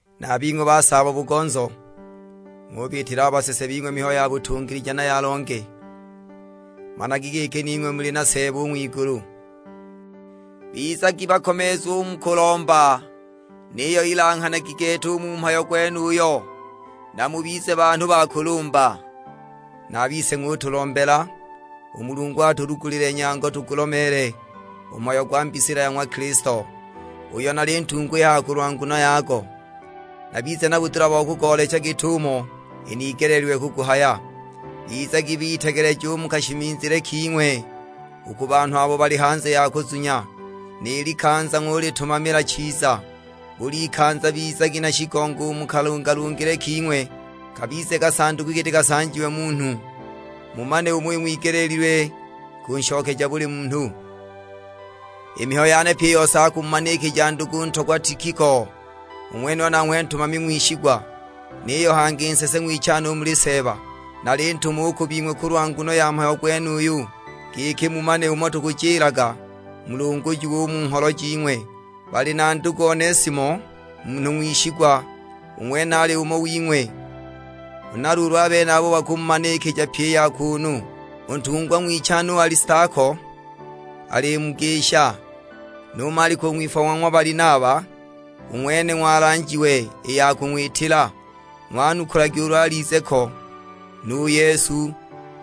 Na a bing'we basaabo-bugonzo, ng'ubiitila a basese bing'we mihayo ya butungilija na ya longe. Managi giki ning'we muli na Seeba u ng'wigulu. Bizagi bakomeezu u mu kulomba, niyo ilanghanagi gete u mu mhayo gwenuyo, na mubize banhu ba kulumba. Na a bise ng'utulombela, u Mulungu atulugulile nyango tugulomeele u mhayo gwa mbisila ya ng'wa Kilisto, uyo nali ntungwa i haha kulwa nguno yago. Nabize na budula bo kugoolecha git'umo inigeleelilwe kuguhaya. Bizagi bitegeleja u mu kashimizile king'we u ku banhu abo bali hanze ya kuzunya; ni likanza ng'ulitumamila chiza. Bul'ikanza bizagi na shigongo u mu kalungalungile king'we, kabize kasanduku giti kasanjiwe munhu, mumane umo ing'wigeleelilwe kunshokeja buli munhu. I mihayo yane pyi i yose akumumanikija ndugu ntogwa Tikiko, u ng'wenuyo nanghwe ntumami ng'wishigwa; niyo hangi nsese ng'wichane u muli Seeba. Nalintuma u ku bing'we kulwa nguno ya mhayo gwenuyu, giki mumane umo tukujilaga, mulungujiwe u mu ngholo jing'we. Bali na ndugu Onesimo, munhu ng'wishigwa. U ng'wene ali umo wing'we; huna luulu a benabo bakumumanikija pyi i ya kuunu. U ntungwa ng'wichane u Alistako alimugisha, nu Maliko u ng'wipfwa wa ng'wa Balinaba (u ng'wene ng'walanjiwe i ya kung'witila; ng'wanukulagi ulu alize ko). Nu Yesu,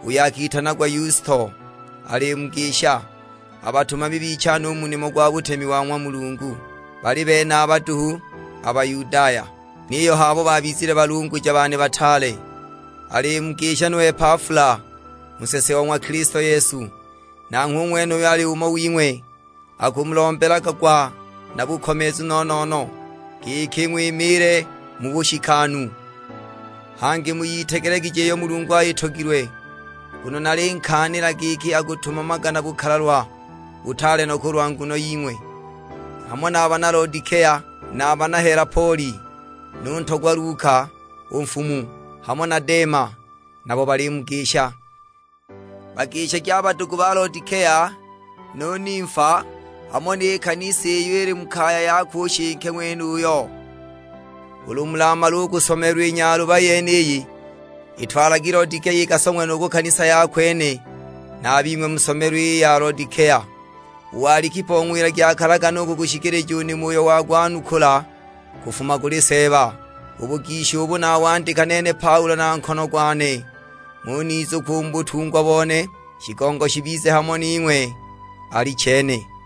uyo akitanagwa Yusto, alimugisha. A batumami bichane u mu nimo gwa butemi wa ng'wa Mulungu bali benaba duhu a Bayudaya; niyo h'abo baabizile balunguja bane bataale. Alimugisha nu Epafula u nsese o ng'wa Kilisto Yesu, nanghwe u ng'wenuyo ali umo wing'we. Akumulombelaga gwa na bukomeezu no-no-no, giki ng'wimiile mu bushikanu, hangi muyitegelegije iyo Mulungu ayitogilwe. Nguno nalinkaanila giki akutumamaga na bukalalwa butaale no kulwa nguno ying'we, hamo na a bana Lodikea, na a bana Helapoli. Nu ntogwa Luka, u nfumu, hamo na Dema; nabo balimugisha. Bagishagi a badugu ba Lodikea; nu Nimfa, hamo ni kanisa iyo ili mu kaya yakwe u nshike ng'wenuyo. Ulu mulamale u kusomelwa i nyaluba yeniyi, itwalagi Lodikea ikasong'we nu ku kanisa ya kwene; na a bing'we musomelwe i ya Lodikea. U Alikipo ng'wilagi akalagane u kugushikilija u nimo uyo wagwanukula kufuma kuli Seeba. U bugisha ubu nawandika nene Paulo na nkono gwane; ng'unizukwa u mu butungwa bone. Shigongo shibize hamo ning'we: Alichene.